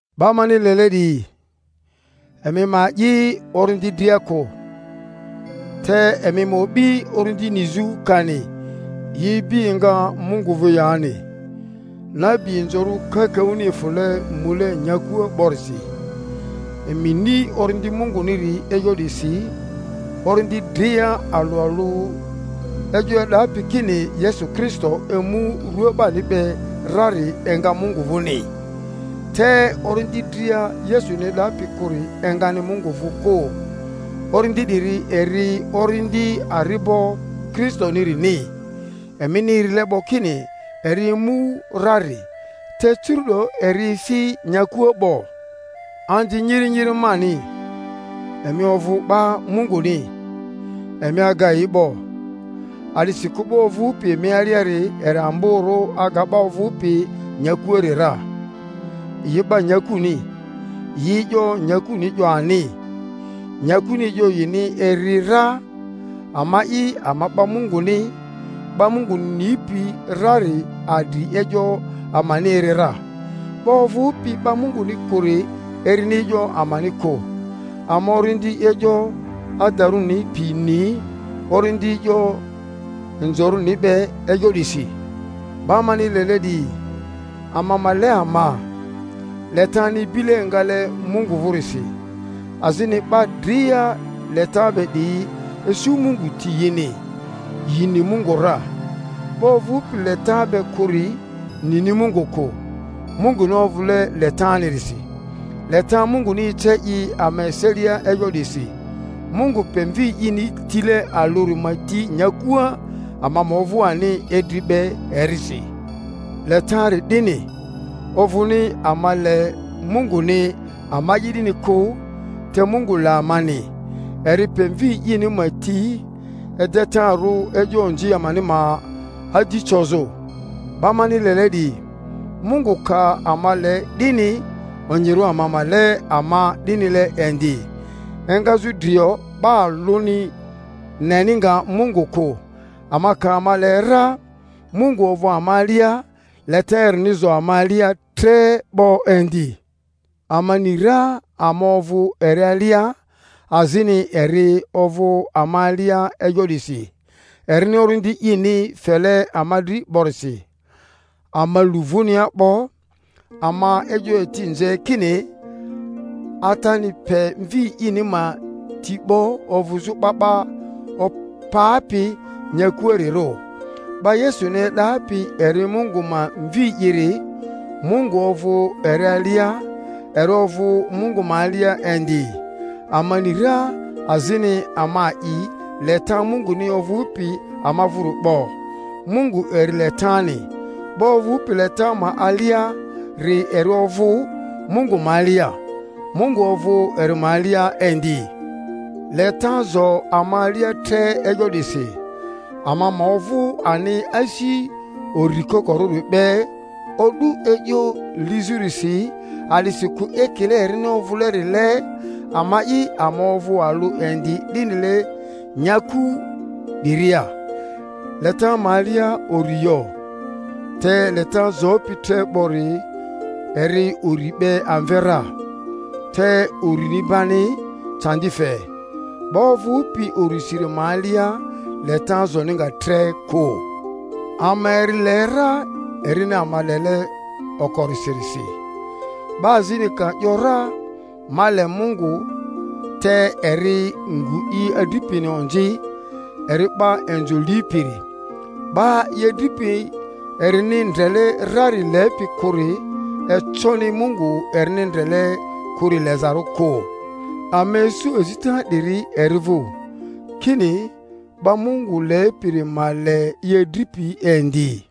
'Ba mani lele 'diyi, emi ma a'i orindi dria kᴜ, te emi ma o'bi orindi nizᴜ kani yi ibi enga Mungu vᴜ yani; nabi inzorᴜ kakaᴜni efᴜle mule nyakua 'borisi. Emi ni Orindi Munguniri e'yo 'disi: orindi dria alᴜ alᴜ e'yo e'dapi kini Yesu Kristo emu rua 'bani be rari enga Mungu vᴜni, te orindi dria Yesuni e'dapi kᴜri engani Mungu vᴜ kᴜ. Orindi 'diri eri orindi ari'bo Kristonirini, emini erile 'bo kini eri emu rari; te curu'do eri efi nyakua 'bo. Anzi nyiri nyiri mani, emi ovᴜ 'ba Munguni, emi aga yi 'bo; a'disikᴜ 'ba ovᴜpi emi aliari eri amborᴜ aga 'ba ovᴜpi nyakuari ra. Yi 'ba nyakuni, yi e'yo nyakuni 'yo ani, nyakuni e'yo yini eri ra. Ama'i ama 'ba Munguni. 'Ba Mungu nipi rari adri e'yo amani eri ra, 'ba ovᴜpi 'ba Mᴜnguni kᴜri erini e'yo amani kᴜ. Ama orindi e'yo adarᴜni pi ni orindi e'yo mzorᴜni be e'yo 'disi. 'Ba mani lele 'diyi, ama ma le ama; letani ibile engale Mungu vᴜrisi, azini 'ba dria leta be 'diyi isu Mungu ti yini, yi ni Mungu ra. 'Ba ovᴜpi leta be kᴜri nini Mungu kᴜ; Munguni ovᴜle letanirisi. Leta Munguni ece i ama eselia e'yo 'disi, Mungu pe Mvi ini tile alᴜri ma ti nyakua, ama ma ovᴜ ani idri be erisi. Letari 'dini, ovᴜni ama le Munguni ama'i 'dini kᴜ, te Mungu le amani, eri pe Mvi ini ma ti edetarᴜ e'yo onzi amani ma adi cozᴜ. 'Ba mani lele 'diyi, Mungu ka ama le 'dini, onyirᴜ ama ma le ama 'dinile indi. Engazᴜ drio 'ba alᴜmi neni nga Mungu kᴜ; ama ka ama le ra, Mungu ovᴜ ama alia, leta erini zo ama alia tre 'bo indi. Ama ni ra ama ovᴜ eri alia, azini eri ovᴜ ama alia e'yo 'disi, erini Orindi ini fele ama dri 'borisi. Ama lu vᴜnia 'bo, ama e'yo eti nze kini Atani pe Mvi ini ma ti 'bo ovᴜzᴜ 'Ba 'ba Opapi nyakuarirᴜ. 'Ba Yesuni e'dapi eri Mungu ma Mvi'iri, Mungu ovᴜ eri alia, eri ovᴜ Mungu ma alia indi. Ama ni ra azini ama a'i leta Munguni ovᴜpi ama vᴜri 'bo. Mungu eri letani; 'ba ovᴜpi leta ma aliari eri ovᴜ Mungu ma alia, Mungu ovᴜ eri ma alia indi. Leta zo ama alia tre e'yo 'disi, ama ma ovᴜ ani asi uri kokorᴜri be o'du e'yo lizᴜrisi; a'disikᴜ ekile erini ovᴜlerile, ama'i ama ovᴜ alᴜ indi 'dinile nyaku 'diria. Leta ma alia uri yo, te leta zopi tre 'bori eri uri 'be amve ra. Te urini bani candi fe; 'ba ovᴜpi urisiri ma alia leta zoni nga tre kᴜ. Ama eri le ra erini ama lele okorisirisi. 'Ba azini ka ‘yora, Ma le Mungu, te eri ngu i adripini onzi, eri 'ba inzo lipiri; 'ba i adripi erini ndrele rari lepi kᴜri econi Mungu erini ndrele kᴜri lezarᴜ kᴜ. Ama isu azita 'diri eri vᴜ, kini, 'ba Mungu lepiri ma le i adripi indi.